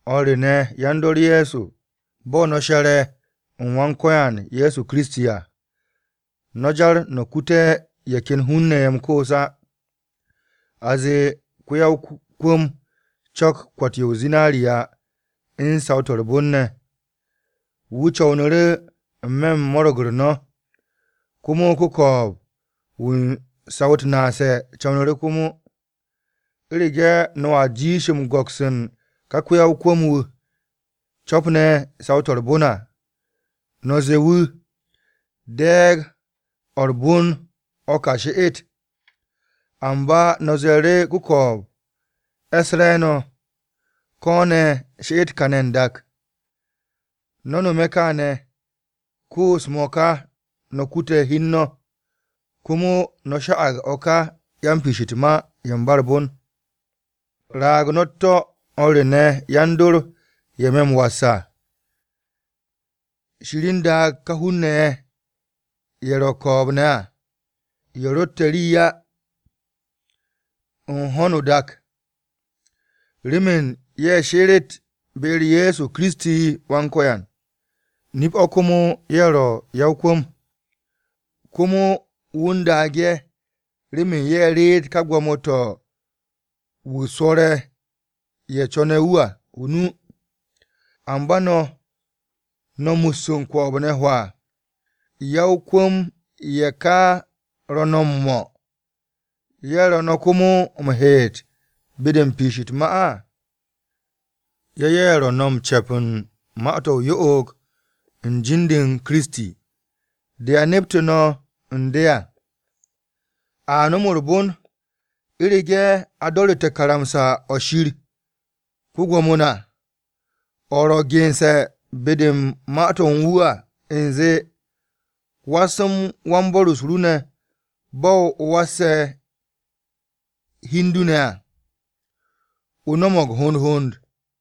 O̱r re ne̱ yan-dor Ye̱so, bo̱ no̱ she̱re̱ u̱n Wan-Ko̱yan na, Ye̱so Kiristi wu̱ ro̱ wa-m-se̱ps à, no̱ jar no̱ kute̱ ye̱ ken hun-ne̱ ye̱ m-koos á. A zee, ko-ya-o-kwu̱m co̱k kwo̱t-yo zinariya u̱n saw-to̱ u̱r-bon ne̱, wu̱ co̱wnu̱ru̱ n-me̱ u̱n mo̱ro̱g-u̱r no̱, komo ko-ko̱o̱b-wu̱ u̱n saw-u̱t naase̱ co̱wnu̱ru̱ komo. U̱rege̱ no̱a jiish m-go̱ks u̱n ka ko-ya-o-kwu̱m-wu̱ co̱pne̱ saw-to̱ u̱r-bon à, no̱ zee wu̱, “De̱e̱g-o̱ u̱r-bon o̱ ka, she'et.” Amba no̱ ze̱e̱ru̱ ko-ko̱o̱b, “E̱s re̱e̱no̱,” ko̱ ne̱ “She'et kane̱ n-dak.” No̱ nome̱ kaane̱, koos-mo̱ ka no̱ kute̱ hi u̱n no̱, komo no̱ sha'ag o̱ ka yan-m-piish u̱t-ma ye̱ ba u̱r-bon. Raag no̱ u̱t-to̱ o̱r re ne̱ yan-dor, ye̱ me̱ m-was à, Shir u̱n daag ka hun-ne̱ ye̱ ro̱ ko̱o̱b-ne̱ à, ye̱ ro̱tte̱ rii á u̱n ho̱no o-dak, remen ye̱ sheret be-u̱r Ye̱so Kiristi Wan-Ko̱yan. Nip-o̱ komo ye̱ ro̱ ya-o-kwu̱m. Komo wu̱ u̱n daag ye̱ remen ye̱ reet ka gwo̱mo-to̱ wu̱ swo̱re̱ ye̱ co̱ne̱ wu̱ à o-nu. Amba no̱, no̱ mus u̱n ko̱o̱b-ne̱ hwaa. ¿Ya-o-kwu̱m-ye̱ ka ro̱ no̱ m-mo̱, ye̱ ro̱ no̱ komo m-heet be-de u̱n piish u̱t-ma? Ye̱ ye̱ ro̱ m-ce̱p u̱n ma-to̱ o-yo'og u̱n jin-de u̱n Kiristi. De a neptu̱ no̱ u̱n de à. A nom u̱r-bon, u̱rege̱ o do̱ru̱te̱ karamsa-o̱ Shir ko-Gwo̱mo na, o̱ ro̱ gense̱ be-de u̱n Ma-to̱ u̱n wu̱ à u̱nze, “Was u̱n wan-bo̱r-o ru ne̱ bo̱ o wase̱ hi u̱n du ne̱ à.” O no̱mo̱g hond hond.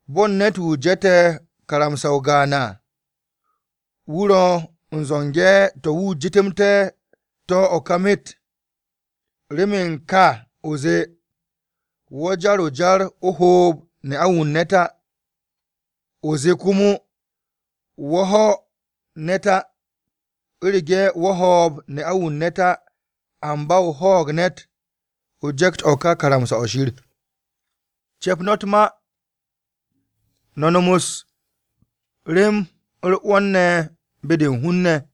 Bo̱ u̱n ne̱t-wu̱ je̱te̱ karamsa-o gaan à, wu̱ ro̱ u̱n zo̱nge̱ to̱ wu̱ jetemte̱ to̱ o̱ ka myet. Remen ka o̱ zee, “Wo̱ jar o-jar o-hoob ne'a-wu̱ u̱n ne̱t á,” o̱ zee komo, “Wo̱ ho̱ ne̱t á,” U̱rege̱ wo̱ ho̱o̱b ne'a-wu̱ u̱n ne̱t á, amba o ho̱o̱g ne̱t, o je̱kt o̱ ka karamsa-o̱ Shir. Ce̱p no̱ u̱t-ma, no̱ nom u̱s-rem u̱r-'wo̱n ne̱ be-de u̱n hun-ne̱,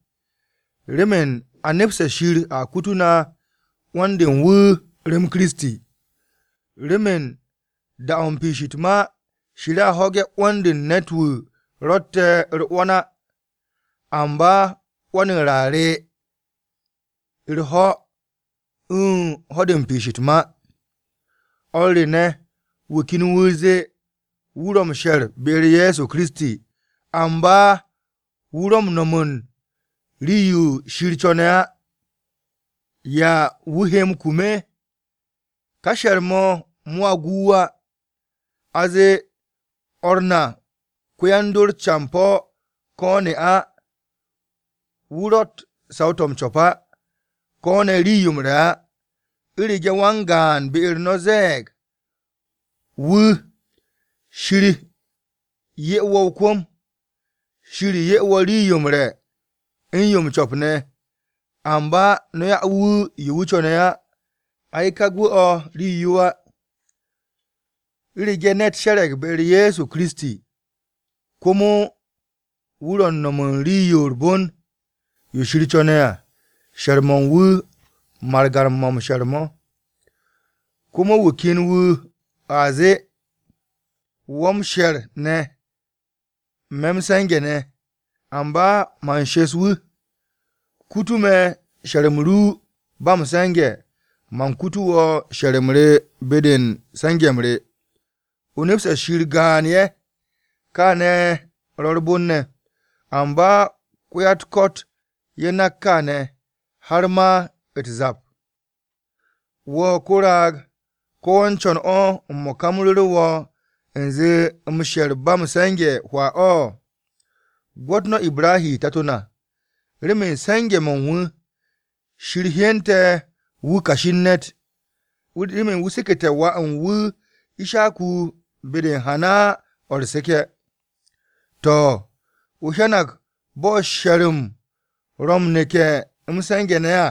remen a nepste̱ Shir a kutu na 'wo̱n-de u̱n wu̱ rem Kiristi. Remen da-o̱ u̱n piish u̱t-ma, Shir a ho̱ge̱ 'wo̱n-de u̱n ne̱t-wu̱ ro̱tte̱ u̱r-'wo̱n á. Amba 'wo̱n-u̱r a re u̱r-ho̱ u̱n ho̱-de u̱n piish u̱t-ma. O̱r re ne̱, wu̱ ken wu̱ zee, wu̱ ro̱ m-she̱r ne̱ be-u̱r Ye̱so Kiristi, amba wu̱ ro̱ m-no̱m u̱n rii-yo Shir co̱ne̱ á. ¿Ya wu̱ he m-kum? Ka she̱r-mo̱ mo̱a gu wu̱ á. A zee, o̱r na ko-yan-dor campo̱ ko̱ ne̱ ne'a, wu̱ ro̱tt saw-to̱ m-co̱p á, ko̱ ne̱ rii-yo m-re̱ á. U̱rege̱ wan-gaan be-u̱r no̱ ze̱e̱g wu̱, “Shir 'ye wo̱ o-kwu̱m. Shir 'ye wo̱ rii-yo m-re̱ u̱n yo m-co̱p ne̱,” amba no̱ 'ya wu̱ yo wu̱ co̱ne̱ á. Ay kaa o̱ gu rii á. U̱rege̱ ne̱t she̱re̱g be-u̱r Ye̱so Kiristi, komo wu̱ ro̱ u̱n no̱m u̱n rii-yo u̱r-bon yo Shir co̱ne̱ á, she̱r-mo̱ u̱n wu̱, margan-mo̱ m-she̱r mo̱. Komo wu̱ ken wu̱ wu̱a zee, “Wo̱ m-she̱r ne̱, me̱ m-se̱nge̱ ne̱.” Amba man shes wu̱, “Kutu̱ me̱ she̱r-m ru ba m-se̱nge̱, man kutu̱ wo̱ she̱r-m re be-de u̱n se̱nge̱-m re.” O nepste̱ Shir gaan ye̱, kaane̱ ro̱ u̱r-bon ne̱! Amba ko̱ ya-u̱t-ko̱t ye̱ nak kaane̱, har ma u̱t-zap. Wo̱ ko-raag! ¿Ko̱ wo̱ u̱n co̱n m-mo̱ka u̱m ru̱ru̱ wo̱ u̱nze m-she̱r ba m-se̱nge̱ hwaa o̱? Gwo̱t no̱ Ibrahi tato na, remen se̱nge̱-mo̱ u̱n wu̱, Shir hyente̱ wu̱ kashi u̱n ne̱t, remen wu̱ sekete̱ wà u̱n wu̱ Ishaku be-de u̱n hana-o̱ u̱r-seke̱. To̱, o hyanag bo̱ she̱r-m ro̱ m-neke̱ m-se̱nge̱ ne̱ à,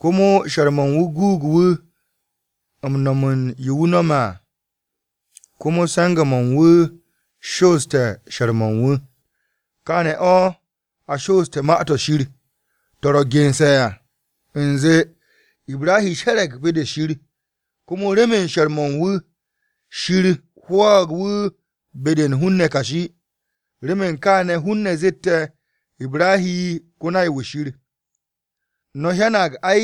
komo she̱r-mo̱ u̱n wu̱ guug wu̱ m-no̱m u̱n yo wu̱ no̱me̱ à komo se̱nge̱-mo̱ u̱n wu̱ shooste̱ she̱r-mo̱ u̱n wu̱. Kaane̱ o̱ a shoose̱ Ma-to̱ Shir to̱ ro̱ gense̱ à u̱nze, “Ibrahi she̱re̱g be-de Shir, komo remen she̱r-mo̱ u̱n wu̱, Shir hwo̱o̱g wu̱ be-de u̱n hun-ne̱ kashi.” Remen kaane̱ hun-ne̱ zette̱ IbrahiKo-nay-wu̱ Shir. No̱ hyanag, ay,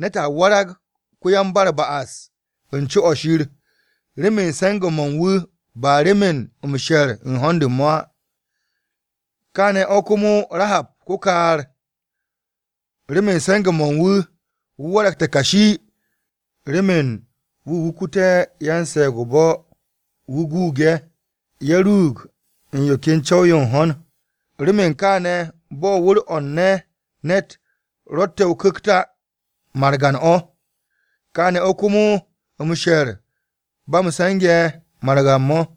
ne̱t a warag ko-yan-ba-u̱r-ba'as u̱n co o̱ Shir, remen se̱nge̱-mo̱ u̱n wu̱, ba remen m-she̱r u̱n hond u̱n mo̱ á. Kaane̱ o̱ komo Rahab, ko-kaar. Remen u̱n se̱nge̱-mo̱ u̱n wu̱, wu̱ waragte̱ kashi. Remen wu̱ wukute̱ yan-se̱e̱g-o-bo̱, wu̱ guug ye̱, ye̱ ruug u̱n yo ken co̱w-yo u̱n ho̱n. Remen kaane̱, bo̱ wu̱r-o̱ u̱n ne̱t-wu̱ ro̱tte̱ o-ku̱kt á margan o̱, kaane̱ o̱ komo m-she̱r ba m-se̱nge̱ margan-mo̱.